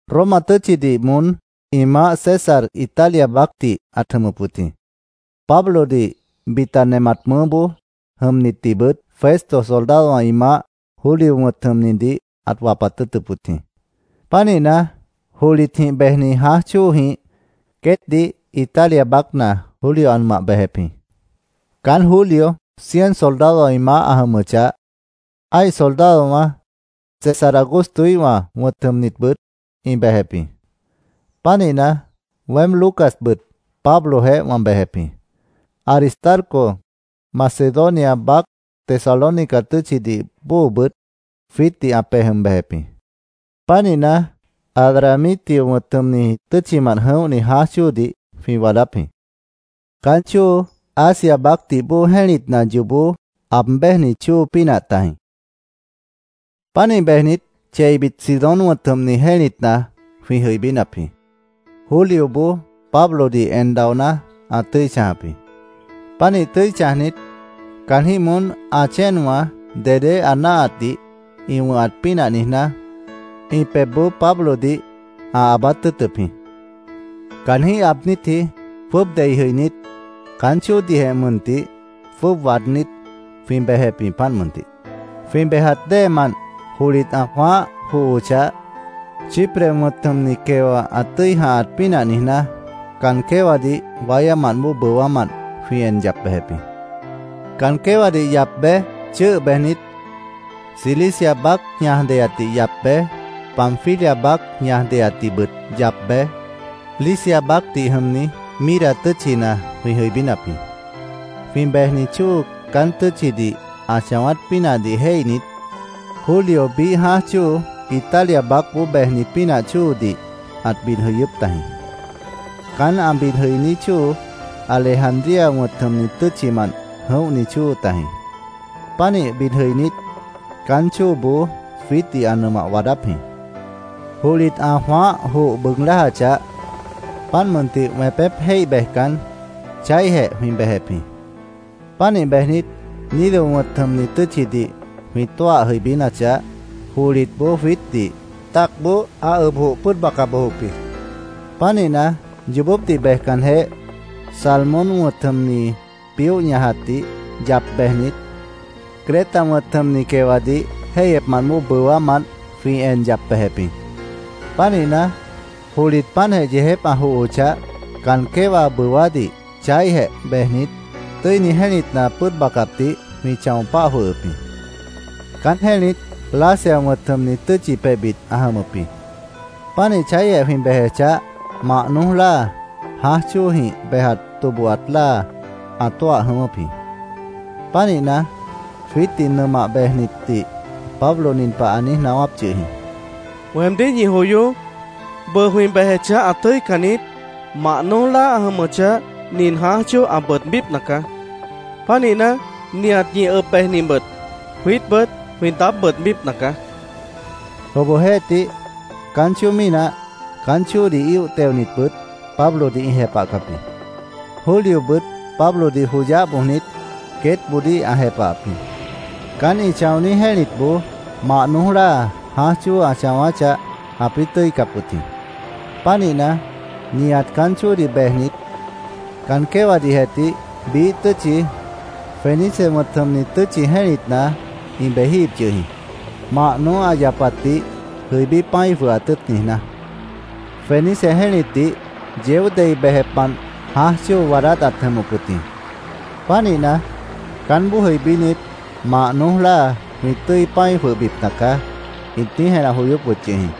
Roma tʉ́tchidih moón ĩ Maáh César Italia baácdih ãt jʉmʉp wʉt jĩ. Pablodih, bita nemat mʉʉ́boó jʉmnitdihbʉt Festo soldadowã ĩ maáh Julio wʉ̃t jʉmnidih ãt wapat tʉ́ʉtʉp wʉt jĩ. Pánihna, johlitjĩh bejni jãáj chóojĩh queétdih Italia baácna Julio ã nʉmah bejep jĩ. Caán Julio cien soldadowã ĩ maáh ã jʉmʉchah, ã́ih soldadowã César Augustoíhwã wʉ̃t jʉmnitbʉt ĩ bejep jĩ. Pánihna, weém Lucasbʉt Pablojeéh wã bejep jĩ. Aristarco, Macedonia baác Tesalónica tʉ́tchidih bóobʉt jwiítdih ã pej jʉm bejep jĩ. Pánihna, Adramitio wʉ̃t jʉmni tʉ́tchimant jʉ̃óhni jãáj chóodih jwĩ waadáp jĩ. Caán chóo Asia baácdih bóo jẽ́litna yoobó aab béjni chóo pínah tajĩ. Pánih bejnit, cheibit Sidón wʉ̃t jʉmni jẽ́litna jwĩ jʉibínap jĩ. Julioboó Pablodih en daoná, ã tʉ́i chãjap jĩ. Pánih tʉ́i chãjnit, caanjĩ́h moón ã chéenwã dedé ã náahatdih ĩ wʉ̃hat pínah niijná, ĩ pebhboó Pablodih ã aabát tʉ́ʉtʉp jĩ. Caanjĩ́h aabnítji jwʉ́ʉb dei jʉinít, caán chóodihjeh mʉntih jwʉ́ʉb waadnít, jwĩ bejep jĩ, páant mʉntih. Jwĩ bejat déemant johlit ã jwãáh johochah, Chipre wʉ̃t jʉmni quewa ã tʉ́i jãhat pínah niijná, caan quéwadih wáyámant bóo bʉwámant jwĩ en yap bejep jĩ. Caan quéwadih yap bej, chʉ́ʉh bejnit, Cilicia baác ñaj deyatdih yap bej, Panfilia baác ñaj deyatdihbʉt yap bej, Licia baácdih jʉmni Mira tʉ́tchina jwĩ jʉibínap jĩ. Jwĩ bejni chóo caán tʉ́tchidih ã chãwát pínahdih jéihnit, Julio biíh jãáj chóo, Italia baácboó bejni pínah chóodih ãt bid jʉyʉ́p tajĩ. Caán ã bid jʉiní chóo Alejandría wʉ̃t jʉmni tʉ́tchimant jʉ̃óhni chóo tajĩ. Pánih bid jʉinít, caán chóoboó jwiítdih ã nʉmah waadáp jĩ. Johlit ã jwãáh joh bʉʉg lájachah, páant mʉntih, wẽpép jéih bejcan, chaíhjeh jwĩ bejep jĩ. Pánih bejnit, Gnido wʉ̃t jʉmni tʉ́tchidih jwĩ tóah jʉibínachah, johlitboó jwiítdih tacboó ã ʉb joh pʉ́ʉd baca bojop jĩ. Pánihna, yoobópdih bejcanjeh, Salmón wʉ̃t jʉmni pióh ñajatdih yap bejnit, Creta wʉ̃t jʉmni quewadih jéihyepmant bóo bʉwámant jwĩ en yap bejep jĩ. Pánihna, johlit páantjeh yeejép ã johochah, caan quéwa bʉwádih chaíhjeh bejnit, Tʉ́ini Jẽ́litna pʉ́ʉd bacapdih jwĩ chão páh jwʉhʉp jĩ. Caán jẽ́lit Lasea wʉ̃t jʉmni tʉ́tchi pebhbit ã jʉmʉp jĩ. Pánih chaíhjeh jwĩ bejechah, mah noój láa, jãáj chóojĩh bejat tobohat láa ã tóah jʉ̃ʉ́wʉ́p jĩ. Pánihna, jwiítdih nʉmah bejnitdih Pablo nin pah ã niíj naáwáp yʉh jĩ: —¡Weemdíh ñi joyoó! Bʉʉ jwĩ bejechah, ã tʉ́ican niít. Mah noój láa ã jʉmʉchah, nin jãáj chóo ã bʉʉdbípna caá. Pánihna, nihat ñi ʉb bejnibʉt, jwiítbʉt jwĩ daáb bʉʉdbípna caá, ã niijíp jĩ. Obohjeéhtih, caán chóo mínah, caán chóodih íoh teonibʉt Pablodih ĩ jepahcap jĩ. Juliobʉt Pablodih joyáh bojnit, queétboodíh ã jepahap jĩ. Caán ĩ chãoní jẽ́litboó mah noój láa jãáj chóo ã chãwáchah, ãpĩ́ tʉ́icap wʉt jĩ. Pánihna, nihat caán chóodih bejnit caan quéwadihjeh tih biíh tʉ́tchi, Fenice wʉ̃t jʉmni tʉ́tchi jẽ́litna ĩ bejíhip yʉh jĩ, mah noój ã yapatdih jʉibí pã́i jwʉhat tʉ́ʉt niijná. Fenice jẽ́litdih yeó dei bejepmant jãáj chóo waadát ãt jʉmʉp wʉt jĩ. Pánihna, “Caánboó jʉibínit, mah noój láa jwĩ tʉ́i pã́i jwʉhbipna caá”, ĩt niíj jenah joyóp wʉt yʉh jĩ.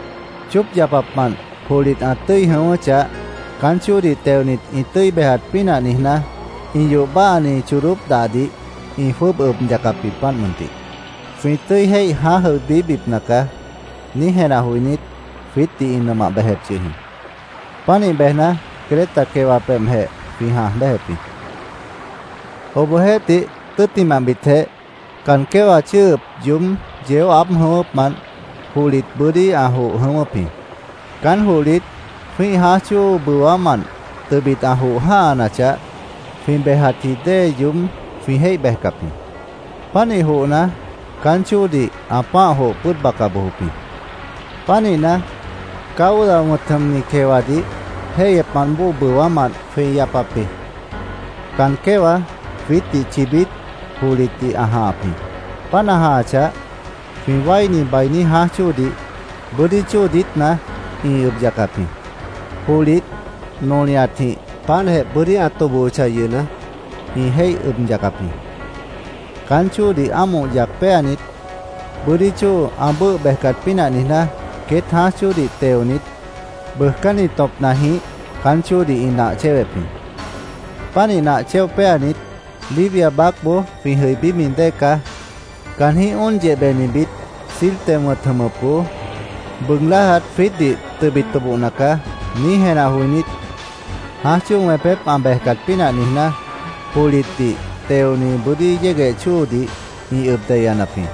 Chóop yapapmant johlit ã tʉ́i jʉ̃ʉ́wʉ́chah, caán chóodih teonit ĩ tʉ́i bejat pínah niijná, ĩ yoh báahani chodóp dahdih ĩ jwʉ́ʉb ʉb yacap jĩ, páant mʉntih. “Jwĩ tʉ́i jéih jãáj jʉibíbipna caá”, niíj jenah joinít, jwiítdih ĩ nʉmah bejep yʉh jĩ. Pánih bejna, Creta quewa pebhjeh jwĩ jãaj béjep jĩ. Obohjeéhtih, tʉ́ttimahbitjeh caan quéwa chʉ́ʉhʉp yoób yeó aáb jʉ̃ʉ́wʉ́pmant johlit bʉ́dí ã joh jʉ̃ʉ́wʉ́p jĩ. Caán johlit jwĩ́ih jãáj chóo bʉwámant tʉbit ã joh jã́hanachah, jwĩ bejatji dée yoób jwĩ jéih bejcap jĩ. Pánih johna, caán chóodih ã pã́ah joh pʉ́ʉd baca bojop jĩ. Pánihna, Cauda wʉ̃t jʉmni quewadih jéihyepmant bóo bʉwámant jwĩ yapap jĩ. Caan quéwa jwiítdih chibít johlitdih ã jãhap jĩ. Páant ã jãhachah, jwĩ wáini bainí jãáj chóodih, bʉ́dí chóo diítna ĩ ʉb yacap jĩ. Johlit nolihatjĩh páantjeh bʉ́dí ã tobohochah yʉhna, ĩ jéih ʉb yacap jĩ. Caán chóodih ámoh yac péanit, bʉ́dí chóo ã bʉ́ʉh bejcat pínah niijná, queét jãáj chóodih teonit bʉʉjcánni tõpnajĩh caán chóodih ĩ nah chéwep jĩ. Pánih nah chéo péanit, “Libia baácboó jwĩ jʉibími dée caá. Caanjĩ́h óon yehbenibit Sirte wʉ̃t jʉmʉpboó bʉʉg lájat jwiítdih tʉbit tobohna caá”, niíj jenah joinít, jãáj chóo wẽpép ã bejcat pínah niijná, johlitdih teoni bʉ́dí yégueh chóodih ĩ ʉb deyanap jĩ.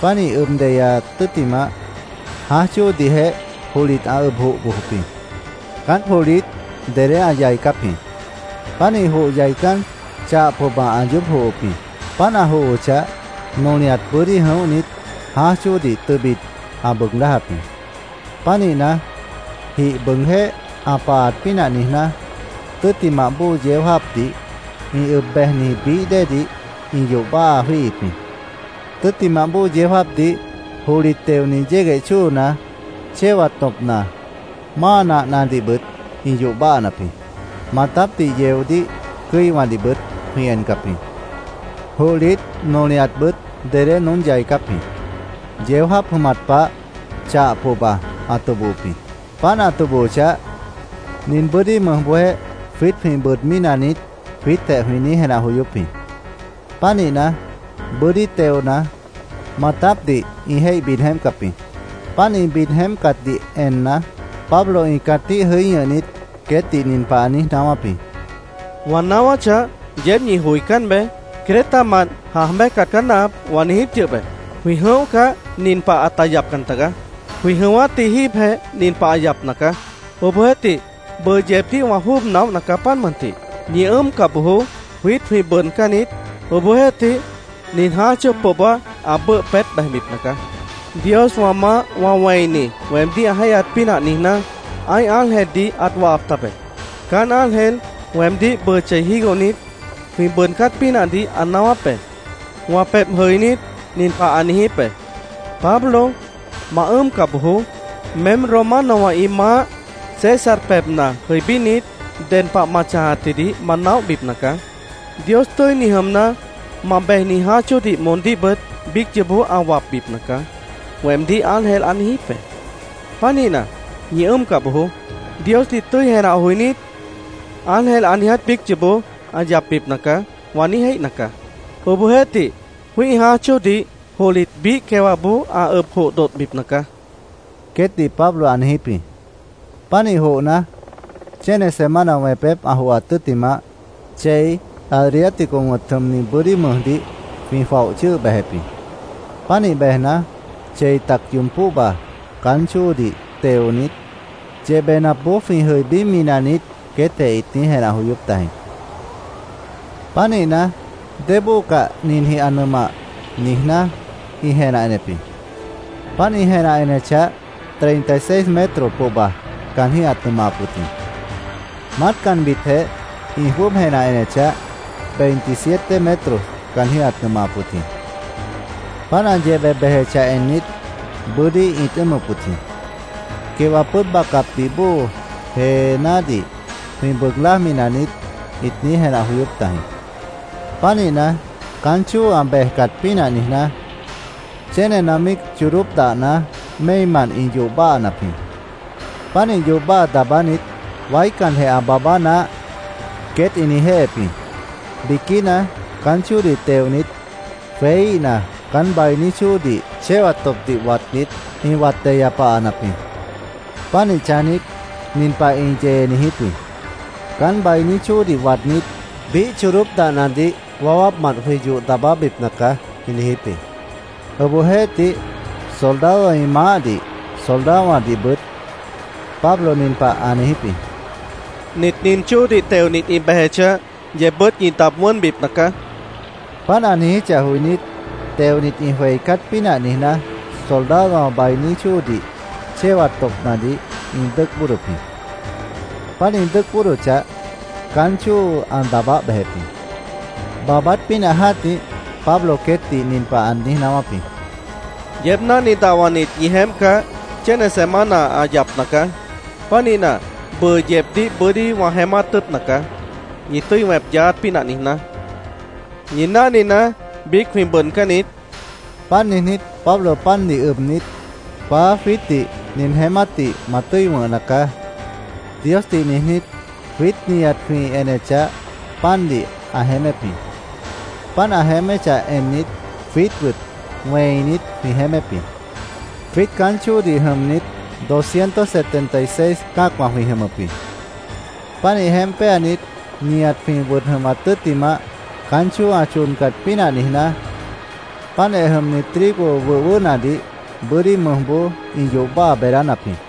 Páant ĩ ʉb deyat tʉ́ttimah, jãáj chóodihjeh johlit ã ʉb joh bojop jĩ. Caán johlit dedé ã yaicáp jĩ. Pánih joh yaicán, chah pohba ã yoób johop jĩ. Páant ã johochah, nolihat bʉ́dí jʉ̃óhnit, jãáj chóodih tʉbit ã bʉʉg lájap jĩ. Pánihna, jih bʉʉgjéh ã pahat pínah niijná, tʉ́ttimah bóo yeó jáapdih ĩ ʉb bejniji bií déedih ĩ yoh báaha jwíihip jĩ. Tʉ́ttimah bóo yeó jáapdih johlit teoni yégueh chóona, chéwat tõpna, máa nahnadihbʉt ĩ yoh báhanap jĩ. Maatápdih yeodíh cʉ́iwãdihbʉt jwĩ encap jĩ. Johlit nolihatbʉt dedé noón yaicáp jĩ. Yeó jáap jʉmat pah chah pohba ã tobohop jĩ. Páant ã tobohochah, “¿Nin bʉ́dí mʉjboó jwiít jwĩ bʉʉdmí naniít?” jwiítjeh jwĩ niíj jenah joyóp jĩ. Pánihna, bʉ́dí teona, maatápdih ĩ jéih bid jeémpcap jĩ. Páant ĩ bid jeémpcatdih enna, Pablo ĩ cãtíh jʉí ñʉhnit, queétdih nin pah ã niíj naáwáp jĩ: —Wã naáwáchah, yeéb ñi joicán beé. ‘Cretamant jãaj béjcat caá náahap’, wã niijíp yʉh be. Jwĩ jʉ̃óhcah, nin pah ãta yapcan tagaá. Jwĩ jʉ̃ʉ́wátji jíibjeh nin pah ã yapna caá. Obohjeéhtih, bʉʉ yeebdíh wã jwʉ́ʉb naóhna caá, páant mʉntih. Ñi ʉ́ʉmca bojoó. Jwiít jwĩ bʉʉdcán niít. Obohjeéhtih, nin jãáj chóo pohba ã bʉ́ʉh peét bejbipna caá. Dios wã maáh wã wẽini weemdíh ã jéihyaat pínah niijná, ã́ih ángeldih ãt wahap tabe. Caán ángel weemdíh bʉʉ chei jígohnit, jwĩ bʉʉdcát pínahdih ã naáwáp be. Wã pebh jʉinít, nin pah ã niijíp be: ‘Pablo, ma ʉ́ʉmca bojoó. Meém Romanowã ĩ maáh César pebhna jʉibínit, ded pah ma chãjatjidih ma naóhbipna caá. Dios tʉ́ini jʉmna, ma bejni jãáj chóodih moondíhbʉt biíc yoobó ã wapbipna caá’, weemdíh ángel ã niijíp be. Pánihna, ñi ʉ́ʉmca bojoó. Diosdih tʉ́i jenah joinít, ‘Ángel ã niiját biíc yoobó ã yapbipna caá’, wã niíj jéihna caá. Obohjeéhtih, jwĩ́ih jãáj chóodih johlit biíh quewãboó ã ʉb joh dodhbipna caá, queétdih Pablo ã niijíp jĩ. Pánih johna, chéne semana wẽpép ã johat tʉ́ttimah, chei, Adriático wʉ̃t jʉmni bʉ́dí mʉjdih jwĩ jwaoh chʉ́ʉh bejep jĩ. Pánih bejna, chei tac yoob póhba caán chóodih teonit “¿Yehbenapboó jwĩ jʉibími naniít?” queétjeh ĩt niíj jenah joyóp tajĩ. Pánihna, “Débóo cah ninjĩh ã nʉmah”, niijná, ĩ jenah enep jĩ. Páant ĩ jenah enechah, treinta y seis metros pohba caanjĩ́h ãt nʉmahap wʉt jĩ. Maátcanbitjeh ĩ jwʉ́ʉb jenah enechah, veintisiete metros caanjĩ́h ãt nʉmahap wʉt jĩ. Páant ã yehbe bejechah ennit, bʉ́dí ĩt ʉ́ʉmʉp wʉt jĩ. “¿Quewa pʉ́ʉd bacapdih bóo jeenádih jwĩ bʉʉg lájmi naniít?” ĩt niíj jenah joyóp tajĩ. Pánihna, caán chóo ã bejcat pínah niijná, chénena míic chodóp dahna méimant ĩ yoh daabánap jĩ. Pánih yoh daabánit, “Waícanjeh ã baabá naáh”, queét ĩ niijjéhep jĩ. Biquína caán chóodih teonit, jweííhna, caán bainí chóodih chéwat tõpdih watnit, ĩ wat deya pahanap jĩ. Pánih chãjnit, nin pah ĩ yee niijíp jĩ: “Caán bainí chóodih waadnít, biíh chodóp dahnadih wawápmant jwĩ yoh daabábipna caá”, ĩ niijíp jĩ. Obohjeéhtih, soldadowã ĩ maáhdih, soldadowãdihbʉt Pablo nin pah ã niijíp jĩ: —Nit nin chóodih teonit ĩ bejechah, yeebbʉ́t ñi daab wʉ́nbipna caá, ã niijíp jĩ. Páant ã niijíchah joinít, teonit ĩ jweicát pínah niijná, soldadowã bainí chóodih chéwat tõpnadih ĩ dʉ́ʉc bóodop jĩ. Páant ĩ dʉ́ʉc bóodochah, caán chóo ã daabáh bejep jĩ. Baabát pínah jã́tih, Pablo queétdih nin pah ã niíj naáwáp jĩ: —Yeéb náhni dahwanit ñi jeémpcah, chéne semana ã yapna caá. Pánihna, bʉʉ yeebdíh bʉ́dí wã jeémát tʉ́ʉtna caá, ñi tʉ́i wẽp yaáát pínah niijná. Ñi náhninaá, biíc jwĩ bʉʉdcán niít, ã niijíp jĩ. Páant niijnít, Pablo pandih ʉbnit, “Paá, jwiítdih nin jeémátdih ma tʉ́i wʉ̃hna caá”, Diosdih niijnít, jwiít nihat jwĩ enechah, pandih ã jeémép jĩ. Páant ã jeéméchah ennit, jwiítbʉt wẽinit jwĩ jeémép jĩ. Jwiít caán chóodih jʉmnit doscientos setenta y seis cã́acwã jwĩ jʉmʉp jĩ. Pánih jeémp péanit, nihat jwĩ wʉd jʉmat tʉ́ttimah, caán chóo ã chodcat pínah niijná, páantjeh jʉmni trigo wʉh wʉʉ́hnadih bʉ́dí mʉjboó ĩ yoh báaha beedánap jĩ.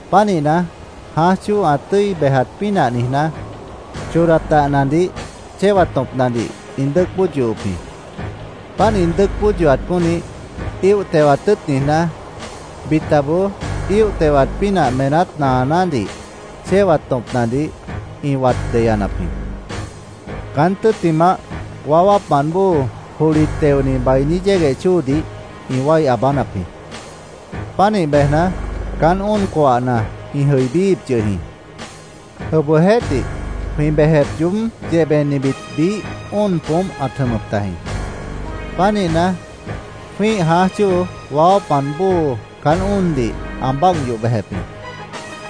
Pánihna, jãáj chóo ã tʉ́i bejat pínah niijná, chodat dahnadih chéwat tõpnadih ĩ dʉ́ʉc bóod yohop jĩ. Páant ĩ dʉ́ʉc bóod yohat pónih, íoh tewat tʉ́ʉt niijná, bitaboó íoh tewat pínah meenát naanádih chéwat tõpnadih ĩ wat deyanap jĩ. Caán tʉ́ttimah, waáwápmant bóo johlit teoni bainí yégueh chóodih ĩ wái aabánap jĩ. Pánih bejna, caán óon coahna ĩ jʉibííhip yʉh jĩ. Obohjeéhtih, jwĩ bejep yoób yehbenibit biíh óon poómp ãt jʉmʉp tajĩ. Pánihna, jwĩ́ih jãáj chóo waáwápmant bóo caán óondih ã báagh yoh bejep jĩ.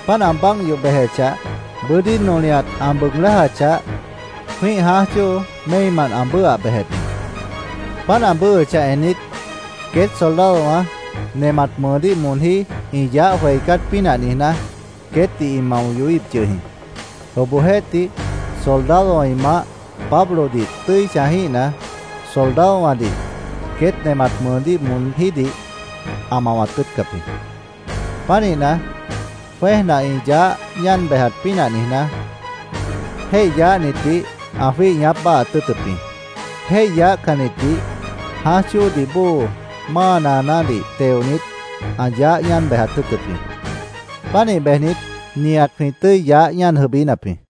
Páant ã báagh yoh bejechah, bʉ́dí nolihat ã bʉʉg lájachah, jwĩ́ih jãáj chóo méimant ã bʉ́ʉhah bejep jĩ. Páant ã bʉ́ʉhʉchah ennit, queét soldadowã nemat mʉʉdíh moonjí ĩ yaáh jweicát pínah niijná, queétdih ĩ mao yohíhip yʉh jĩ. Obohjeéhtih, soldadowã ĩ maáh Pablodih tʉ́i chãjíhna, soldadowãdih queét nemat mʉʉdíh moonjídih ã mawat tʉ́ʉtcap jĩ. Pánihna, jwẽ́ejna ĩ yaáh ñáan bejat pínah niijná, jéih yaáhnitdih ã jwíih ñaáp báahaat tʉ́ʉtʉp jĩ. Jéih yaáhcannitdih jãáj chóodih bóo máa naanádih teonit, ã yaáh ñáan bejat tʉ́ʉtʉp jĩ. Pánih bejnit, nihat jwĩ tʉ́i yaáh ñáan jʉibínap jĩ.